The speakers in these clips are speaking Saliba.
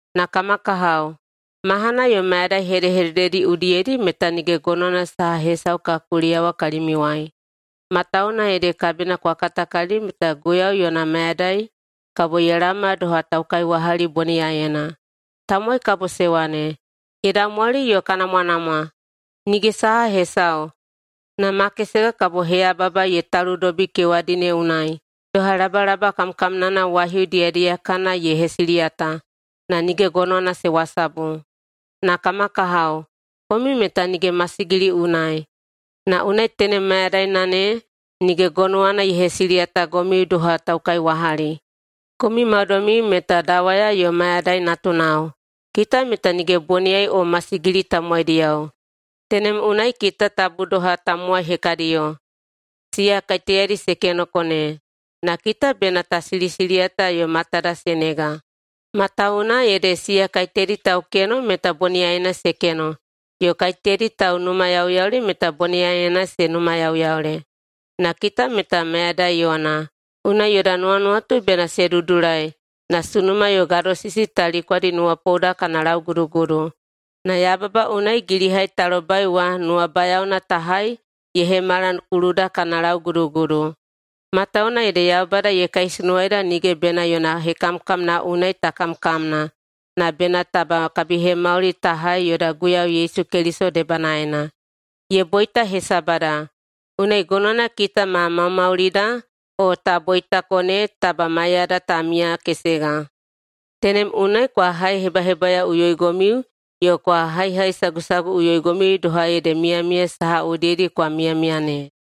Na kama kahao, mahana yo mayadai hedehedededi udiyedi meta nige gonowana saha hesau ka kuliyawa kalimiuwai, matawuwuna ede kabina kwa katakalili meta Guiyau yona mayadai kabo ye laoma doha taukaiwahali boniyaiyena. Tamowai kabo se wane, “Ye daumwali yo ka namwanamwa, nige saha hesau!” Na makesega kabo heyababa ye taludobi kewadi ne unai doha labalaba kamkamnana waihiu diyadiyakana ye hesiliyata, na nige gonowana se wasabu. Na kama kahao, komiu meta nige masigili unai, na unai tenem mayadaina ne nige gonowana ye hesiliyatagomiu doha taukaiwahali. Komiu maudoimiu meta dawaya yo mayadai natunao. Kita meta nige boniyai o masigili tamowaidiyao. Tenem unai kita tabu doha tamowai hekadiyo, siya kaiteyadi se kenoko ne. Na kita bena ta silisiliyata yo matada se nega. Matawuwuna ede siya kaiteyadi taukeno meta boniyaiyena se keno, yo kaiteyadi taunumayauyaule meta boniyaiyena se numayauyaule. Na kita meta mayadai yona, unai yoda nuwanuwatu bena se dudulai na sunuma yo gadosisi ta likwadi nuwapouda kana laugudugudu, na yababa unai gilihai ta lobai wa nuwabayaona ta hai ye hemala kuluda kana laugudugudu. Matawuwuna ede Yaubada ye kaisunuwaeida nige bena yona hekamkamna unai ta kamkamna, na bena taba kabihemauli ta hai yoda Guiyau Yesu Keliso debanaena. Ye boita hesabada, unai gonowana kita ma maumaulida o ta boitako ne taba maiyada ta miyakesega. Tenem unai kwa haihebahebayaoꞌuyoigomiu yo kwa haihaisagusaguꞌuyoigomiu doha ede miyamiya saha udiyedi kwa miyamiya ne.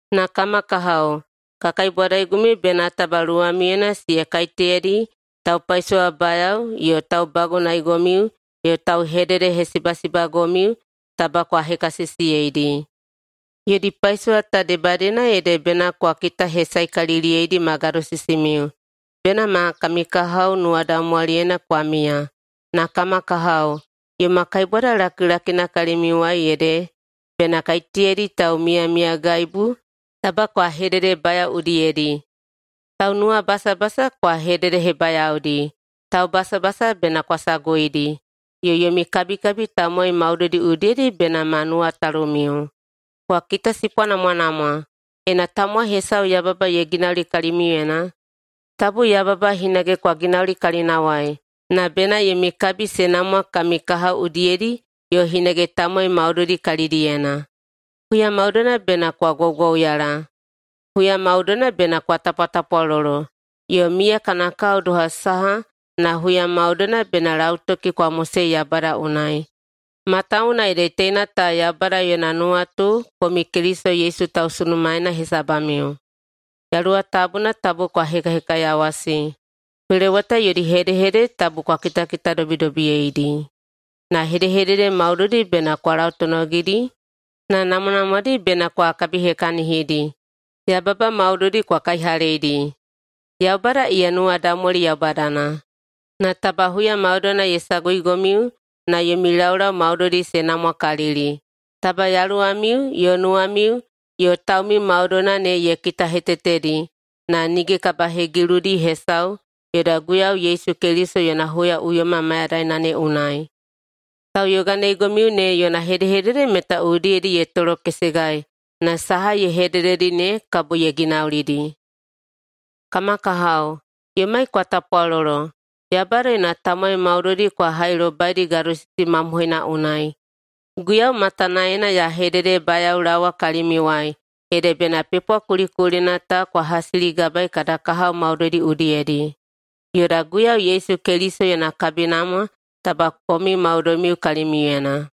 Na kama kahao, ka kaibwadaigomiu bena taba luwamiuyena siya kaiteyadi taupaisowabayao yo taubagunaeigomiu yo tauhededehesibasibagomiu, taba kwa hekasisiyeidi. Yodi paisowa ta debadiyena ede bena kwa kitahesaekaliliyeidi ma gadosisimiu. Bena ma kami kahao nuwadaumwaliyena kwa miya. Na kama kahao, yoma kaibwada lakilakina kalimiuwai ede bena kaiteyadi taumiyamiyagaibu taba kwa hededebayao udiyedi. Taunuwabasabasa kwa hededehebayaodi, taubasabasa bena kwa saguidi, yo yomi kabikabi tamowai maudoidi udiyedi bena ma nuwatalumiu. Kwa kitasipwanamwanamwa, ena tamowai hesau yababa ye ginauli kalimiuyena, tabu yababa hinage kwa ginauli kalinawai, na bena yomi kabi se namwa kami kahao udiyedi yo hinage tamowai maudoidi kalidiyena. Huya maudoina bena kwa gwaugwauyala, huya maudoina bena kwa tapwatapwalolo, yo miya kana kao doha saha na huya maudoina bena lautoki kwa mosei Yaubada unai, matawuwuna ede teina ta Yaubada yona nuwatu komiu Keliso Yesu tausunumaena hesabamiu. Yaluwa Tabuna tabu kwa hekahekaiyawasi. Peloweta yodi hedehedede tabu kwa kitakitadobidobiyeidi, na hedehedede maudoidi bena kwa lautonogidi na namwanamwadi bena kwa kabihekahinidi. Yababa maudoidi kwa kaihaleidi. Yaubada iya nuwadaumwali Yaubadana, na taba ye saguigomiu na yomi laulau maudoidi se namwakalili. Taba yaluwamiu yo nuwamiu yo taumiu maudoina ne ye kitahetetedi na nige kabahegiludi hesau yoda Guiyau Yesu Keliso yona huyaꞌuyoma mayadaina ne unai. Tauyoganeigomiu ne yona hedehedede meta udiyedi ye tolokesegai na saha ye hedededi ne kabo ye ginaulidi. Kama kahao, yomai kwa tapwalolo. Yaubada yona tamowai maudoidi kwa hailobaidi gadosisi mamohoina unai. Guiyau matanaena ya hededebayaolaowa kalimiuwai ede bena pepwa kulikulina ta kwa hasiligabaei kada kahao maudoidi udiyedi. Yoda Guiyau Yesu Keliso yona kabinamwa taba komiu maudoimiu kalimiuyena.